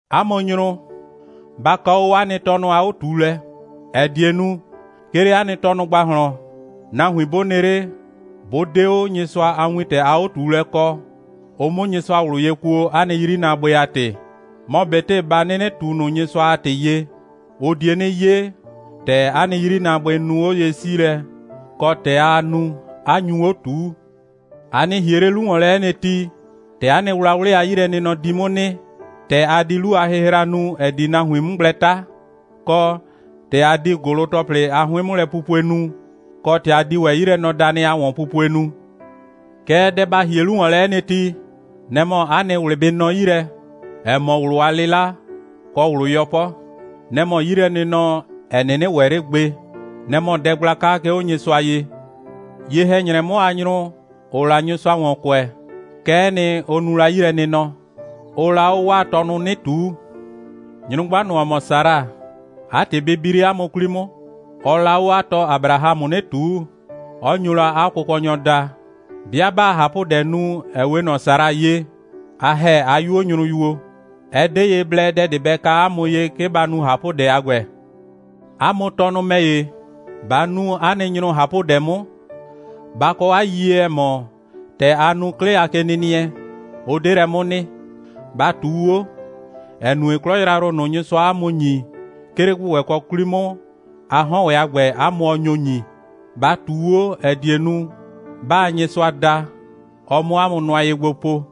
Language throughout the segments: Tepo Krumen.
'A mʋ nyrʋ, ba kɔ 'o 'a nɩ tɔnʋ a 'o꞊tuulɛ, ‑ɛ die nu, 'ke 'le 'a nɩ tɔnʋ ‑gbahlɔn, nahuin 'bʋ nɩ 'le, 'bʋ 'de 'o Nyɩsʋa a wintɛ a 'o꞊tuulɛ kɔ, ʋ 'mʋ Nyɩsʋa ꞊wlʋ ye kuo, 'a nɩ 'yrinaabʋɩ a ‑tɩ. Mɔ ꞊betɩ ba 'nɩnɩ ꞊tu ꞊nʋ Nyɩsʋa a ‑tɩ ye, ʋ die 'nɩ 'ye, ‑tɛ 'a nɩ 'yrinaabʋɩ nu 'oye'siilɛ, kɔ ‑tɛ aa nu, 'a nyu 'o ꞊tuu. A nɩ ‑hie 'le 'lu ‑wɔn lɛ 'ɛ nɩ ti, ‑tɛ 'a nɩ wlawlɩ a 'yilɛnɩnɔ di 'mʋ nɩ, ‑tɛ a di 'lu a hɩhra nu, ‑ɛ di nahuin 'mʋ gblɛ 'ta, kɔ, ‑tɛ a di ‑gʋlʋ‑tɔplɩ a 'hʋɩn'mʋlɛpupue nu, kɔ, ‑tɛ a di ‑wɛ 'yilɛnɔdanɩ a ‑wɔnpupue nu. Kɛɛ, dɛ ba ‑hie 'lu ‑wɔn lɛ 'ɛ nɩ ti, nɛ‑ mɔ 'a nɩ ꞊wlɩ bɩ nɔ 'yi lɛ, ‑ɛ mɔ ꞊wlʋ a 'lɩla, kɔ ꞊wlʋ 'yɔpɔ. Nɛ‑ mɔ 'yilɛnɩnɔ, ‑ɛ 'nɩnɩ ‑wɛ 'le gbe. Nɛ‑ mɔ dɛ gblaka, 'ke 'o Nyɩsʋa ye. Ye‑hɛ‑nyrɛ 'mʋ a nyrʋ, ‑ʋʋ la Nyɩsʋa ‑wɔn kʋɛ, kɛ'ɛ nɩ, ʋ nu la 'yilɛnɩnɔ. Ʋʋ la 'o 'waa tɔnʋ 'nɩ ꞊tuu. Nyrʋgba ꞊nʋ, ‑ɔ mɔ Sara, 'a ‑tɩ bɩ bi 'le 'a mʋ 'kwli 'mʋ. Ɔɔ la 'o 'a tɔ Abrahamʋ 'nɩ ꞊tuu, 'ɔ nyo la 'a kʋkɔnyɔ daa. 'Bɩa 'baa ꞊hapʋdɛ nu, ‑ɛ 'we ꞊nɔ Sara ye, a ‑hɛ 'a 'yuo nyrʋyuo. Ɛ 'de ye blɛ dɛ ꞊de bɛ ka 'a mʋ ye, 'ke ba nu ꞊hapʋdɛ a ‑gbɛ. 'A mʋ tɔnʋ ‑mɛ ‑ye, ba nu 'a nɩ nyrʋ ꞊hapʋdɛ 'mʋ. Ba kɔ 'a yiyie, ‑ɛ mɔ, ‑tɛ a nu 'klɩ a kenɩnɩɛ, ʋ 'de lɛ 'mʋ nɩ. Ba ꞊tuu 'o, ‑ɛ nue, 'klɔ yrayrʋ ꞊nʋ, Nyɩsʋaa 'a mʋ ‑nyi, 'ke 'le ‑gbʋgbɛkɔ 'kwli 'mʋ, a 'hɔn ‑wɛ a ‑gbɛ, 'a mʋ ɔ nyo ‑nyi. Ba ꞊tuu 'o, ‑ɛ die nu, 'baa Nyɩsʋa da, ɔ 'mʋ 'a mʋ nʋa ye gbo po.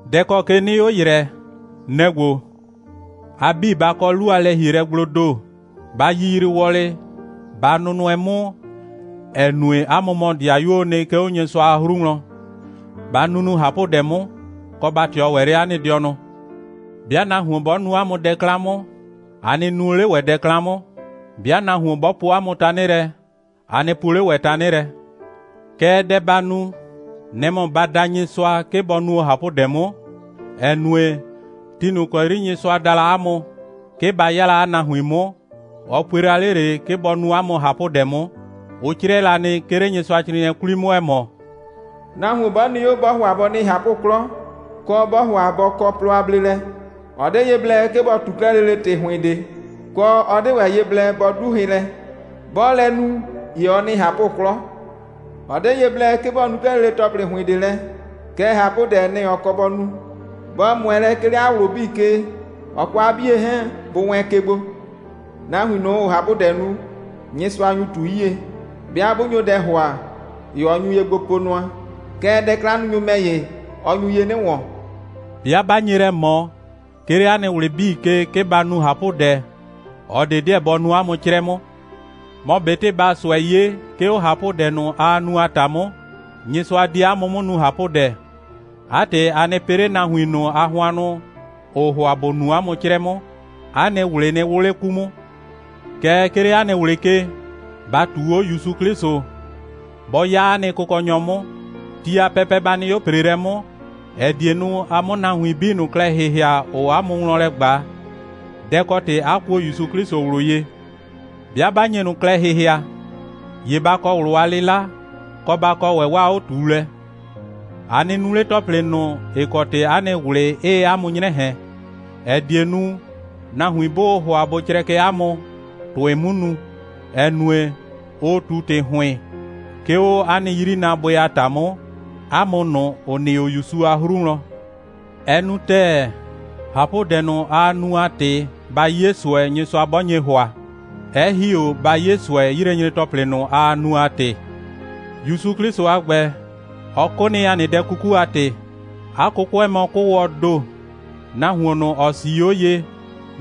Dɛ ‑kɔ ke 'nɩɩ 'o ‑yrɛ, nɛ‑ ‑gbo: A 'bii, ba kɔ 'lu a lɛ‑hielɛgbloo ‑do. Ba yiyrii wɔlɩ, ba nʋnʋɛ 'mʋ, ‑ɛ nue, 'a mʋ mɔ 'dɩayuoo nɩ, 'ke 'o Nyɩsʋa a 'hru wlɔn. Ba nunu ꞊hapʋdɛ 'mʋ, kɔ, ba ꞊tɩɔ ‑wɛ 'le 'a nɩ dɩɔnʋ. 'Bɩa nahuon 'bɔ nu 'a mʋ dɛ 'klan 'mʋ, a nɩ nuo 'le ‑wɛ dɛ 'klan 'mʋ. 'Bɩa nahuon 'bɔ poo 'a mʋ tanɩ lɛ, a nɩ puo 'le ‑wɛ tanɩ lɛ. Kɛɛ, dɛ ba nu, nɛ‑ mɔ ba da Nyɩsʋa, 'ke bɔ nuo ꞊hapʋdɛ 'mʋ, ‑ɛ nue, ti ꞊nʋ ‑kɔ 'yri Nyɩsʋa da la 'a mʋ, 'ke ba 'ya 'a nahuin 'mʋ, ɔ pue la 'le ꞊le, 'ke bɔ nu 'a mʋ ꞊hapʋdɛ 'mʋ. Ʋ 'crɛɛ la nɩ, 'ke 'le Nyɩsʋacrɩɩnɩɛ 'kwli 'mʋ, ‑ɛ mɔ: «Nahuon 'bɔ nɩ 'o, 'bɔɔ ‑hʋa bɔ nɩ ꞊hapʋ'klɔ, kɔ, 'bɔɔ ‑hʋa bɔ kɔ plɔ a bleelɛ, ɔ 'de ye blɛ, 'ke bɔ ꞊tu 'klɛɛ lele ‑tɩ ‑hʋɩn ꞊de, kɔ, ɔ 'de ‑wɛ ye blɛ bɔ 'du hɩ lɛ. 'Bɔɔ lɛ nu, ‑ye ɔ nɩ ꞊hapʋ'klɔ. Ɔ 'de ye blɛ, 'ke bɔ nu 'klɛɛ lele ‑tɔplɩ ‑hʋɩn ꞊de lɛ, kɛɛ, ꞊hapʋdɛ, nɛ‑ ɔ kɔ bɔ nu, bɔ ꞊mʋɛ lɛ, 'ke 'le 'a ꞊wlʋ 'bii ke, ɔ kɔ 'a 'bie 'hɛɛn, bʋ wɛɛn ke gbo. Nahuin ꞊nʋ, ‑ʋʋ ꞊hapʋdɛ nu, Nyɩsʋa nyu ꞊tu 'yie. 'Bɩa 'bʋ nyo dɛ ‑hʋa, ‑ye ɔ nyu ye gbo po nʋa. Kɛɛ, dɛ'klannunyʋ ‑mɛ ‑ye, ɔ nyu ye 'nɩ ‑wɔn.» 'Bɩa 'ba nye lɛ ꞊mɔ, 'ke 'le 'a nɩ ꞊wlɩ 'bii ke, 'ke ba nu ꞊hapʋdɛ, ꞊ɔ ꞊de 'deɛ bɔ nu 'a mʋ 'crɛ 'mʋ. Mɔ ꞊betɩ baa ꞊sʋɛ 'ye, 'ke 'o ꞊hapʋdɛ ꞊nʋ, aa nu a ‑ta 'mʋ, Nyɩsʋa di 'a mʋ 'mʋ nu ꞊hapʋdɛ. 'A ‑tɩ, a nɩ pɩ 'le nahuin ꞊nʋ a hʋannʋ, ‑ʋʋ ‑hʋa ‑bʋ nu 'a mʋ 'crɛ 'mʋ. 'A nɩ ꞊wlɩ nɩ 'wʋ 'le 'ku 'mʋ. Kɛɛ, 'ke 'le 'a nɩ ꞊wlɩ ke, ba ꞊tuu 'o ‑Yusu 'Klɩsʋ. Bɔ 'ya 'a nɩ Kʋkɔnyɔ 'mʋ. Ti a pɛpɛ, ba nɩ 'o ‑preelɛ 'mʋ, ‑ɛ die nu, a 'mʋ nahuin 'bii ꞊nʋ klɛ ‑hɩhɩa, ‑ʋʋ 'a mʋ wlɔn lɛ ꞊gba, dɛ‑ kɔ ‑tɩ 'a kuo ‑Yusu 'Klɩsʋ ꞊wlʋ ye. 'Bɩa 'ba nye ꞊nʋ klɛ ‑hɩhɩa, ‑ye ba kɔ ꞊wlʋ a 'lɩla, kɔ, ba kɔ ‑wɛ 'waa 'o꞊tuulɛ. A nɩ nu 'le ‑tɔplɩ ꞊nʋ, ‑ɩ kɔ ‑tɩ 'a nɩ ꞊wlɩ 'ɩɩ 'a mʋ 'nyrɛ ꞊hɛn, ‑ɛ die nu, nahuin 'bʋʋ ‑hʋa bʋ crɛkɛ 'a mʋ, ‑tʋɩ 'mu nu, ‑ɛ nue, ʋʋ ꞊tu ‑tɩ ‑hʋɩn, 'ke 'o 'a nɩ 'yrinaabʋɩ a ‑ta 'mʋ, 'a mʋ ꞊nʋ, ‑ʋ nɩ 'o ‑Yusu a 'hru wlɔn. Ɛ nu ‑tɛɛ, ꞊hapʋdɛ ꞊nʋ, aa nu a ‑tɩ, ba 'ye ꞊sʋɛ, Nyɩsʋa 'bɔ nye ‑hʋa, 'ɛ ‑hi 'o ba 'ye ꞊sʋɛ, 'yilɛnyre‑tɔplɩ ꞊nʋ, aa nu a ‑tɩ. ‑Yusu 'Klɩsʋ a ‑gbɛ, ɔ 'kʋ nɩ, ‑a nɩ dɛ 'kuku a ‑tɩ. 'A 'kʋkʋɛ mɔ 'kʋʋwɔɔ ‑do. Nahuon ꞊nʋ, ‑ɔ 'sii 'o ye,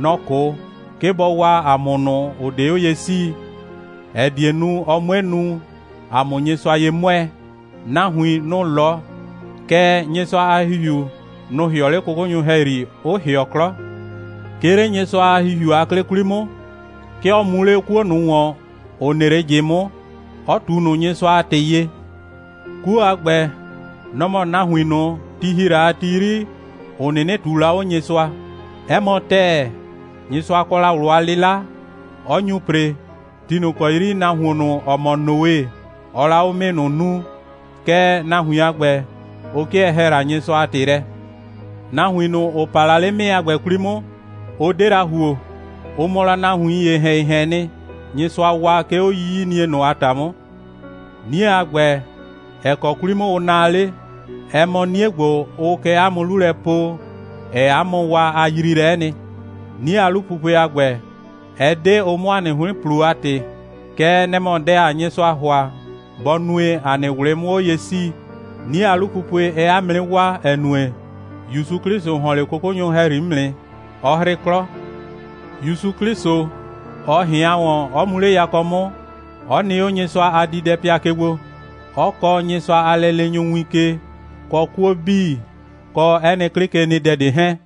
nɔ‑ 'kʋ, 'ke bɔ waa ‑a mʋ ꞊nʋ, ‑ʋ 'de 'o ye 'sii, ‑ɛ die nu, ɔ 'mue nu, ‑a 'mʋ Nyɩsʋa ye 'mʋɛɛ. Nahuin, nʋ‑ 'lɔ, kɛɛ, Nyɩsʋa a ‑Hihiu, nʋ‑ ‑hɩɔ 'le 'kʋkʋnyʋ ‑hɛyri, 'ʋ ‑hɩɔ 'klɔ. 'Ke 'le Nyɩsʋa a ‑Hihiu a 'klɩ 'kwli 'mʋ, 'ke ɔ mu 'le 'kuo ꞊nʋ ‑wɔn, ‑ɔ nɩ 'le ꞊jɩ 'mʋ, 'ɔ ꞊tu ꞊nʋ Nyɩsʋa a ‑tɩ ye. 'Kuo a ‑gbɛ, nɔ‑ mɔ nahuin ꞊nʋ, ti ‑hi la a ti 'yri, ‑ʋ 'nɩnɩ ꞊tuu la 'o Nyɩsʋa. 'Ɛ mɔ ‑tɛɛ, Nyɩsʋa kɔ la ꞊wlʋ a 'lɩla, 'ɔ nyu ‑pre, ti ꞊nʋ ‑kɔ 'yri nahuon ꞊nʋ, ‑ɔ mɔ Noe, ɔɔ la 'o 'mɩɩ ꞊nʋ nuu, kɛɛ, nahuin a ‑gbɛ, ʋ 'kɩɛ ‑hɛɛ la Nyɩsʋa a ‑tɩ lɛ. Nahuin ꞊nʋ, ‑ʋ pa la 'le 'mɩɩ a ‑gbɛ 'kwli 'mʋ, ʋ 'de la ‑huo. Ʋ mɔ la nahuiin ‑yehɛn‑yehɛɛn nɩ, Nyɩsʋa waa, 'ke 'o 'yiyinie ꞊nʋ a ‑ta 'mʋ. 'Nie a ‑gbɛ, ‑ɛ kɔ 'kwli 'mʋ ʋ naa 'le, ɛ mɔ 'nie ‑gbo, ʋʋ kɛ 'a mʋ 'lu lɛ po, ‑ɛɛ 'a mʋ waa a yriilɛ'ɛ nɩ. 'Nie a 'lupupue a ‑gbɛ, ɛ 'de ʋ 'mʋ 'a nɩ 'hʋɩn ‑plo a ‑tɩ. Kɛɛ, nɛ‑ mɔ dɛ, ‑aa Nyɩsʋa ‑hʋa, bɔ nue, ‑a nɩ ꞊wlɩ 'mʋ 'o ye 'sii. 'Nie a 'lupupue, ɛɛ 'a mʋ 'nɩ waa, ‑ɛ nue, ‑Yusu 'Klɩsʋ ‑hɔn 'le 'kʋkʋnyʋ ‑hɛyri 'mʋ nɩ, 'ɔ 'hrɩ 'klɔ. ‑Yusu 'Klɩsʋ, ɔ ꞊hɩan ‑wɔn, 'ɔ mu 'le yakɔ 'mʋ, 'ɔ nɩ 'o Nyɩsʋa a diidɛpɩa ke gbo, 'ɔ kɔɔ Nyɩsʋa a lɛleenyʋ win ke, kɔ 'kuo 'bii, kɔ 'ɛ nɩ 'klɩkenɩdɛ ꞊de 'hɛɛn.